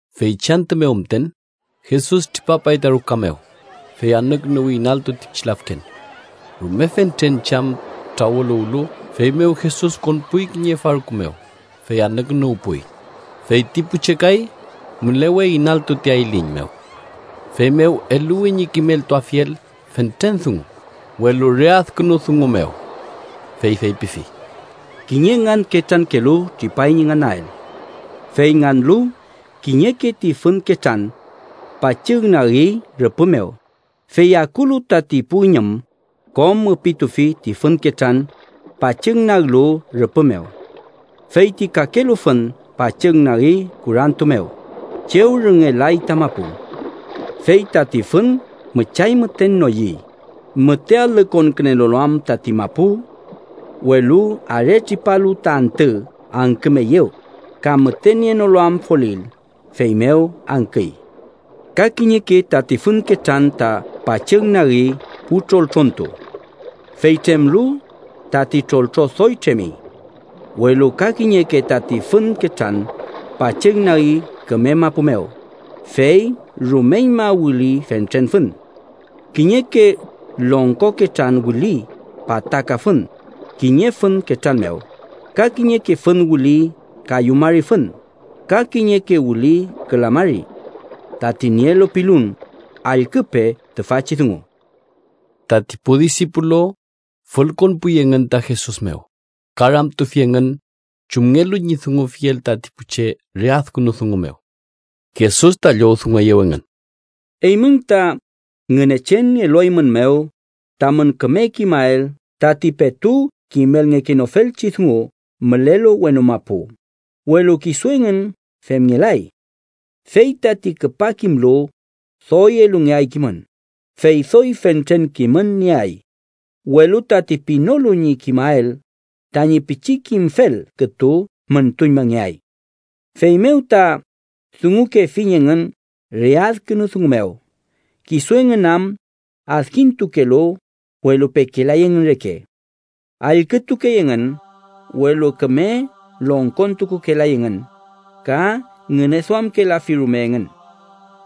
Feychi antü mew müten Jesus tripapay ta ruka mew, fey anükünuwi inaltu ti pichi lafken. Rume fentren che am trawüluwlu, feymew Jesus konpuy kiñe farku mew fey anükünuwpuy, fey ti pu che kay mülewey inaltu ti ayliñ mew. Feymew eluwi ñi kimeltuafiel fentren dungu, welu re adkünu dungu mew. Fey feypifi: “Kiñe nganketrankelu tripay ñi nganael. Fey nganlu, kiñeke ti fün ketran pachügnagi rüpü mew, fey akulu tati pu üñüm, kom üpitufi ti fün ketran pachügnaglu rüpü mew. Fey ti kakelu fün pachügnagi kurantu mew, chew rüngelay ta mapu. Fey tati fün müchay müten noyüy, müte alü konkülenolu am tati mapu. Welu aretripalu ta antü, angkümeyew, ka müte nienolu am folil, feymew angküy. “Ka kiñeke tati fün ketran ta pachügnagi pu troltrontu. Fey tremlu, tati troltro doy tremi. Welu ka kiñeke tati fün ketran pachügnagi küme mapu mew, fey rumeñma wüli fentren fün. Kiñeke longko ketran wüli pataka fün kiñe fün ketran mew, ka kiñeke fün wüli kayu mari fün, ka kiñeke wüli küla mari. Tati nielu pilun, allküpe tüfachi dungu.” Tati pu disipulu fülkonpuy engün ta Jesus mew ka ramtufi engün chumngelu ñi dungufiel tati pu che re adkünu dungu mew. Jesus ta llowdungueyew engün: “Eymün ta Ngünechen elueymünmew tamün küme kimael tati petu kimelngekenofelchi dungu mülelu wenu mapu, welu kisu engün femngelay. Fey tati küpa kimlu, doy elungeay kimün, fey doy fentren kimün nieay. Welu tati pinolu ñi kimael, tañi pichi kimfel kütu müntuñmangeay. Feymew ta dungukefiñ engün re adkünu dungun mew: ‘Kisu engün am adkintukelu, welu pekelay engün reke. Allkütukey engün, welu küme longkontukukelay engün ka ngüneduamkelafi rume engün.’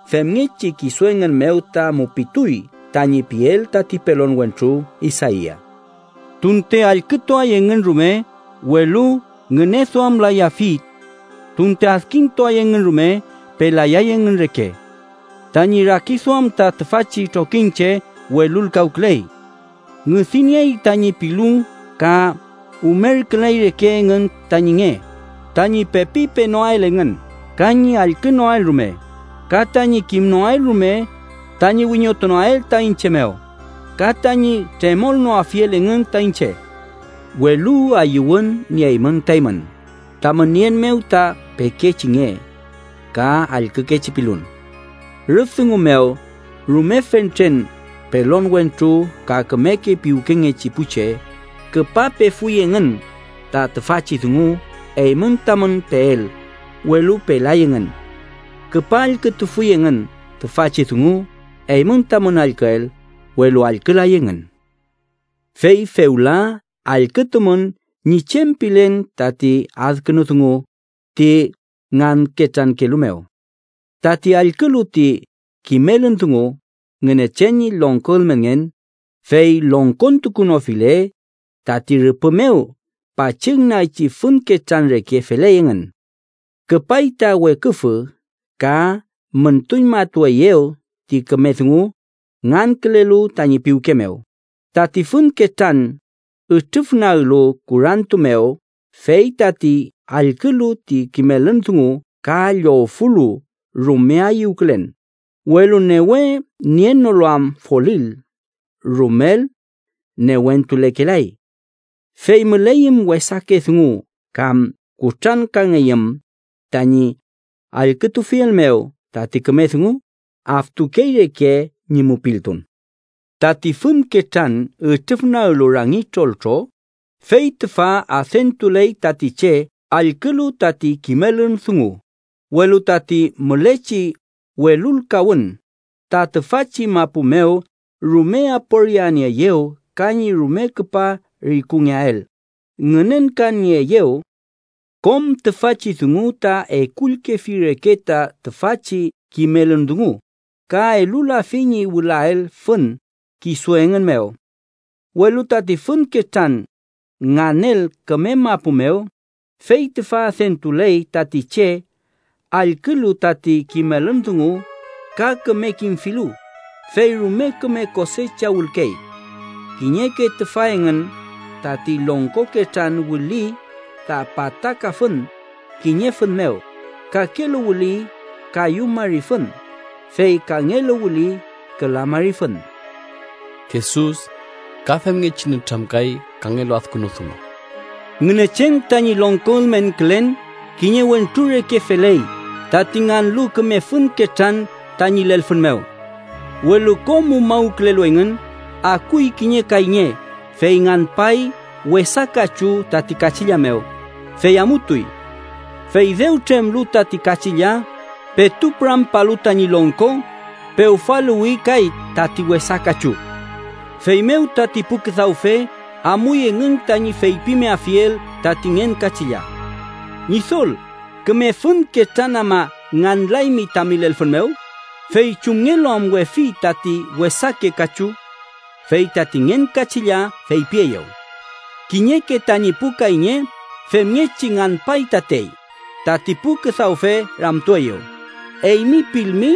Femngechi, kisu engün mew ta mupituy tañi piel tati pelon wentru Isaia: “ ‘Tunte allkütuay engün rume, welu ngüneduamlayafi. Tunte adkintuay engün rume, pelayay engün reke. Tañi rakiduam ta tüfachi trokiñche welulkawküley. Ngüdi niey tañi pilun ka umerküley reke engün tañi nge, tañi pepi penoael engün ka ñi allkünoael rume, ka tañi kimnoael rume, tañi wiñotunoael ta iñche mew ka tañi tremolnoafiel engün ta iñche.’ Welu ayüwün nieymün ta eymün, tamün nien mew ta pekechi nge ka allkükechi pilun. Rüf dungu mew, rume fentren pelon wentru ka kümeke piwkengechi pu che küpa pefuy engün ta tüfachi dungu eymün tamün peel, welu pelay engün. Küpa allkütufuy engün tüfachi dungu eymün tamün allküel, welu allkülay engün. “Fey fewla allkütumün ñi chem pilen tati adkünu dungu ti nganketrankelu mew: Tati allkülu ti kimelün dungu Ngünechen ñi longko ülmenngen, fey longkontukunofile, tati rüpü mew pachügnagchi fün ketran reke feley engün. Küpay ta weküfü ka müntuñmatueyew ti küme dungu ngankülelu tañi piwke mew. Tati fün ketran ütrüfnaglu kurantu mew fey tati allkülu ti kimelün dungu ka llowfulu rume ayüwkülen, welu newe nienolu am folil, rumel newentulekelay. Fey müleyüm wesake dungu kam kutrankangeyüm tañi allkütufiel mew tati küme dungu, aftukey reke ñi mupiltun. Tati fün ketran ütrüfnaglu rangi troltro, fey tüfa adentuley tati che allkülu tati kimelün dungu, welu tati mülechi welulkawün ta tüfachi mapu mew rume aporianieeyew ka ñi rume küpa rikungeael ngünenkanieeyew. Kom tüfachi dungu ta ekullkefi reke ta tüfachi kimelün dungu ka elulafi ñi wülael fün kisu engün mew. Welu tati fün ketran nganel küme mapu mew, fey tüfa adentuley tati che allkülu tati kimelün dungu ka küme kimfilu, fey rume küme kosecha wülkey. Kiñeke tüfa engün tati longko ketran wüli ta pataka fün kiñe fün mew, kakelu wüli kayu mari fün, fey kangelu wüli küla mari fün.” Jesus ka femngechi nütramkay kangelu adkünu dungu: “Ngünechen tañi longko ülmenkülen kiñe wentru reke feley tati nganlu küme fün ketran tañi lelfün mew. Welu kom umawkülelu engün, akuy kiñe kayñe, fey nganpay wesa kachu tati kachilla mew, fey amutuy. Fey dew tremlu tati kachilla petu pürampalu tañi longko, pewfaluwi kay tati wesa kachu. “Feymew tati pu küdawfe amuy engün tañi feypimeafiel tati ngen kachilla: ‘Ñidol, ¿küme fün ketran ama nganlaymi tami lelfün mew? ¿Fey chumngelu am wefi tati wesake kachu?’ Fey tati ngen kachilla feypieyew: ‘Kiñeke tañi pu kayñe femngechi nganpay tatey.’ Tati pu küdawfe ramtueyew: ‘Eymi pilmi,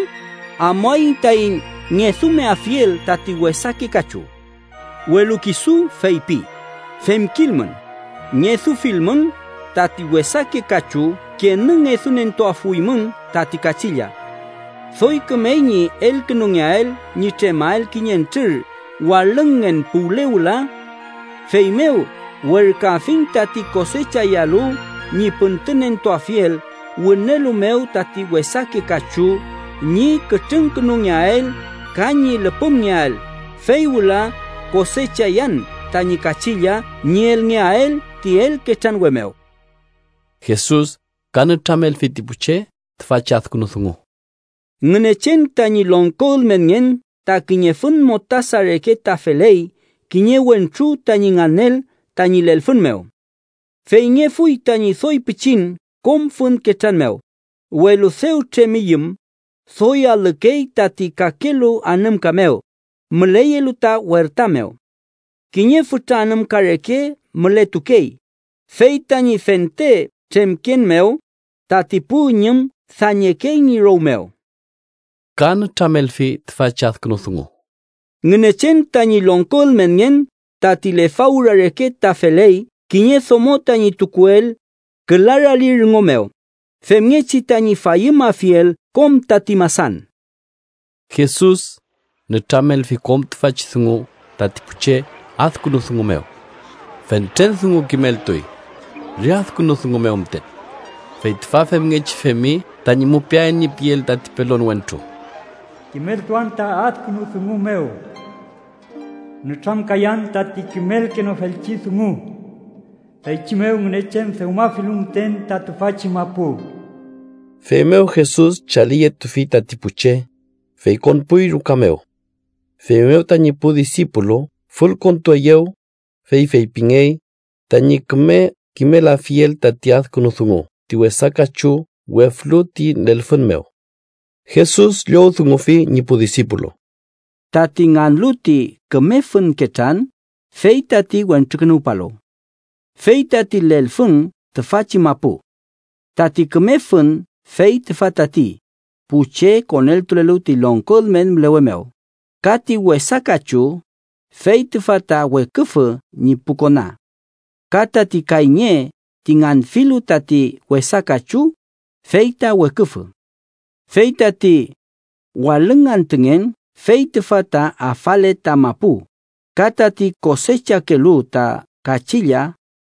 amuaiñ taiñ ngedumeafiel tati wesake kachu.’ Welu kisu feypi: ‘Femkilmün, ngedufilmün tati wesake kachu kenü, ngedunentuafuymün tati kachilla. Doy kümey ñi elukünungeael ñi tremael kiñentrür walüngngen puwle wüla. Feymew werküafiñ tati kosechayalu ñi püntünentuafiel wünelu mew tati wesake kachu ñi kütrüngkünungeael, ka ñi lüpümngeael, fey wüla kosechayan tañi kachilla ñi elngeael ti elketranwe mew.’” Jesus ka nütramelfi ti pu che tüfachi adkünu dungu: “Ngünechen tañi longko ülmenngen ta kiñe fün mostasa reke ta feley kiñe wentru tañi nganel tañi lelfün mew. Feyngefuy tañi doy pichin kom fün ketran mew, welu dew tremiyüm, doy alükey tati kakelu anümka mew müleyelu ta werta mew. Kiñe fütra anümka reke mületukey, fey tañi fente tremken mew tati pu üñüm dañekey ñi row mew.” Ka nütramelfi tüfachi adkünu dungu: “Ngünechen tañi longko ülmenngen tati lefawra reke ta feley kiñe domo tañi tukuel küla rali rüngo mew, femngechi tañi fayümafiel kom tati masan.” Jesus nütramelfi kom tüfachi dungu tati pu che adkünu dungu mew. Fentren dungu kimeltuy re adkünu dungu mew müten. Fey tüfa femngechi femi tañi mupiael ñi piel tati pelon wentru: “Kimeltuan ta adkünu dungu mew. Nütramkayan tati kimelkenofelchi dungu, feychi mew Ngünechen dewmafilu müten ta tüfachi mapu.” Feymew Jesus chaliyetufi tati pu che, fey konpuy ruka mew. Feymew tañi pu disipulu fülkontueyew, fey feypingey tañi küme kimelafiel tati adkünu dungu ti wesa kachu weflu ti lelfün mew. Jesus llowdungufi ñi pu disipulu: “Tati nganlu ti küme fün ketran fey tati Wentrukünuwpalu. Fey tati lelfün tüfachi mapu. Tati küme fün fey tüfa tati pu che koneltulelu ti longko ülmen mülewe mew, ka ti wesa kachu fey tüfa ta weküfü ñi pu kona. Ka tati kayñe ti nganfilu tati wesa kachu, fey ta weküfü. Fey tati walüng antüngen fey tüfa ta afale ta mapu, ka tati kosechakelu ta kachilla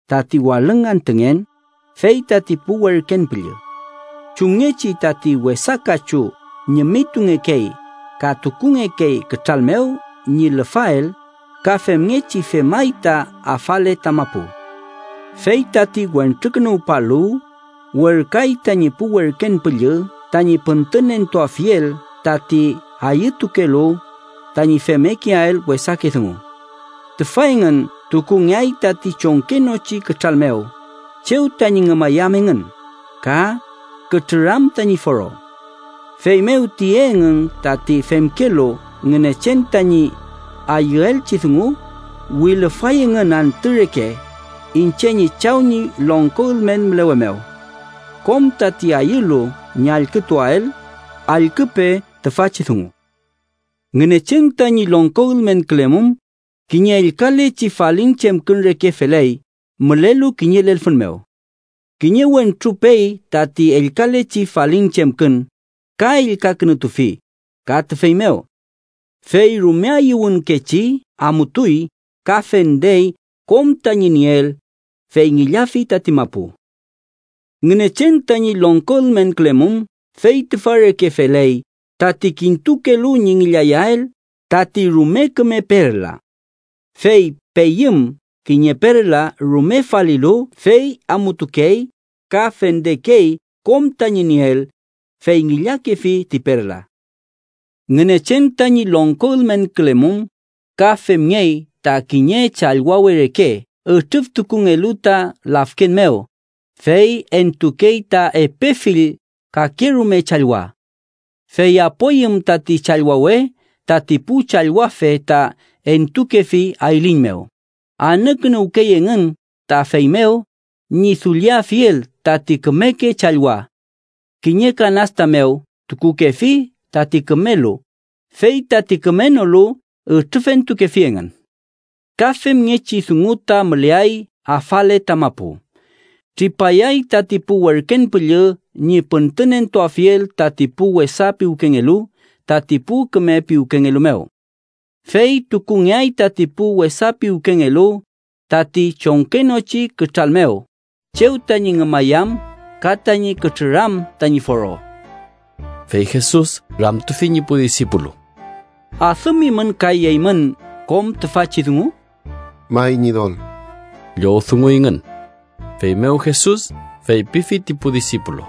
tati walüng antüngen, fey tati pu werken püllü. Chumngechi tati wesa kachu ñimitungekey ka tukungekey kütral mew ñi lüfael, ka femngechi femay ta afale ta mapu. Fey tati Wentrukünuwpalu werküay tañi pu werken püllü tañi püntünentuafiel tati ayütukelu tañi femmekeael wesake dungu. Tüfa engün tukungeay tati chongkenochi kütral mew, chew tañi ngümayam engün ka kütrüram tañi foro. Feymew tiye engün tati femkelu Ngünechen tañi ayüelchi dungu, wilüfay engün antü reke iñche ñi Chaw ñi longko ülmen mülewe mew. Kom tati ayülu ñi allkütuael, allküpe tüfachi dungu. “Ngünechen tañi longko ülmenkülemum kiñe ellkalechi falin chemkün reke feley mülelu kiñe lelfün mew. Kiñe wentru pey tati ellkalechi falin chemkün, ka ellkakünutufi ka tüfey mew. Fey rume ayüwünkechi amutuy ka fendey kom tañi nieel, fey ngillafi tati mapu. “Ngünechen tañi longko ülmenkülemum fey tüfa reke feley tati kintukelu ñi ngillayael tati rume küme perla. Fey peyüm kiñe perla rume falilu, fey amutukey ka fendekey kom tañi nieel, fey ngillakefi ti perla. “Ngünechen tañi longko ülmenkülemum ka femngey ta kiñe challwawe reke ütrüftukungelu ta lafken mew, fey entukey ta epe fill kakerume challwa. Fey apoyüm tati challwawe, tati pu challwafe ta entukefi ayliñ mew, anükünuwkey engün ta feymew ñi dulliafiel tati kümeke challwa. Kiñe kanasta mew tukukefi tati kümelu, fey tati kümenolu ütrüfentukefi engün. Ka femngechi dungu ta müleay afale ta mapu: tripayay tati pu werken püllü ñi püntünentuafiel tati pu wesa piwkengelu tati pu küme piwkengelu mew. Fey tukungeay tati pu wesa piwkengelu tati chongkenochi kütral mew, chew tañi ngümayam ka tañi kütrüram tañi foro.” Fey Jesus ramtufi ñi pu disipulu: —¿Adümimün kay eymün kom tüfachi dungu? —May, Ñidol ―llowdunguyngün. Feymew Jesus feypifi ti pu disipulu: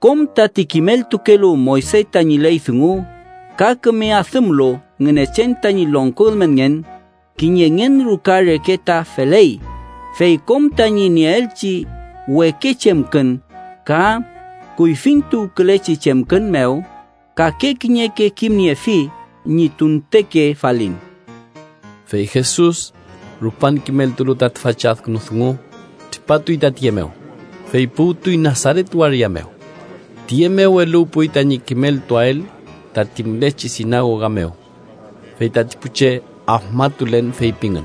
—Kom tati kimeltukelu Moyse tañi ley dungu ka küme adümlu Ngünechen tañi longko ülmenngen, kiñe ngen ruka reke ta feley, fey kom tañi nieelchi weke chemkün ka kuyfintuwkülechi chemkün mew, kake kiñeke kimniefi ñi tunteke falin. Fey Jesus rupan kimeltulu ta tüfachi adkünu dungu, tripatuy ta tiye mew, fey puwtuy Nasaret waria mew. Tüye mew eluwpuy tañi kimeltuael tati mülechi sinagoga mew. Fey tati pu che afmatulen feypingün: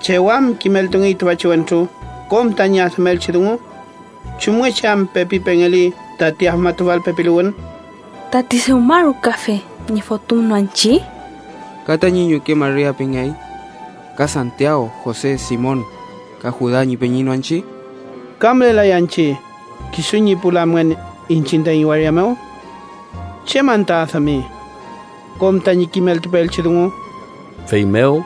—¿Chew am kimeltungey tüfachi wentru kom tañi adümelchi dungu? ¿Chumngechi am pepi pengeli tati afmatufal pepiluwün? ¿Tati dewmarukafe ñi fotüm no anchi? ¿Ka tañi ñuke Maria pingey? ¿Ka Santiaw, Jose, Simon ka Juda ñi peñi no anchi? ¿Ka mülelay anchi kisu ñi pu lamngen iñchiñ taiñ waria mew? ¿Chew anta adümi kom tañi kimeltupeelchi dungu? Feymew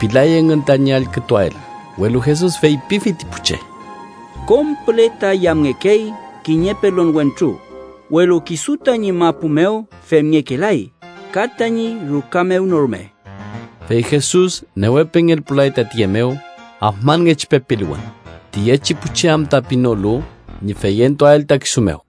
pilay engün tañi allkütuael, welu Jesus feypifi ti pu che: —Kom püle ta yamngekey kiñe pelon wentru, welu kisu tañi mapu mew femngekelay ka tañi ruka mew no rume. Fey Jesus newe pengelpulay ta tiye mew afmanngechi pepiluwün, tiyechi pu che am ta pinolu ñi feyentuael ta kisu mew.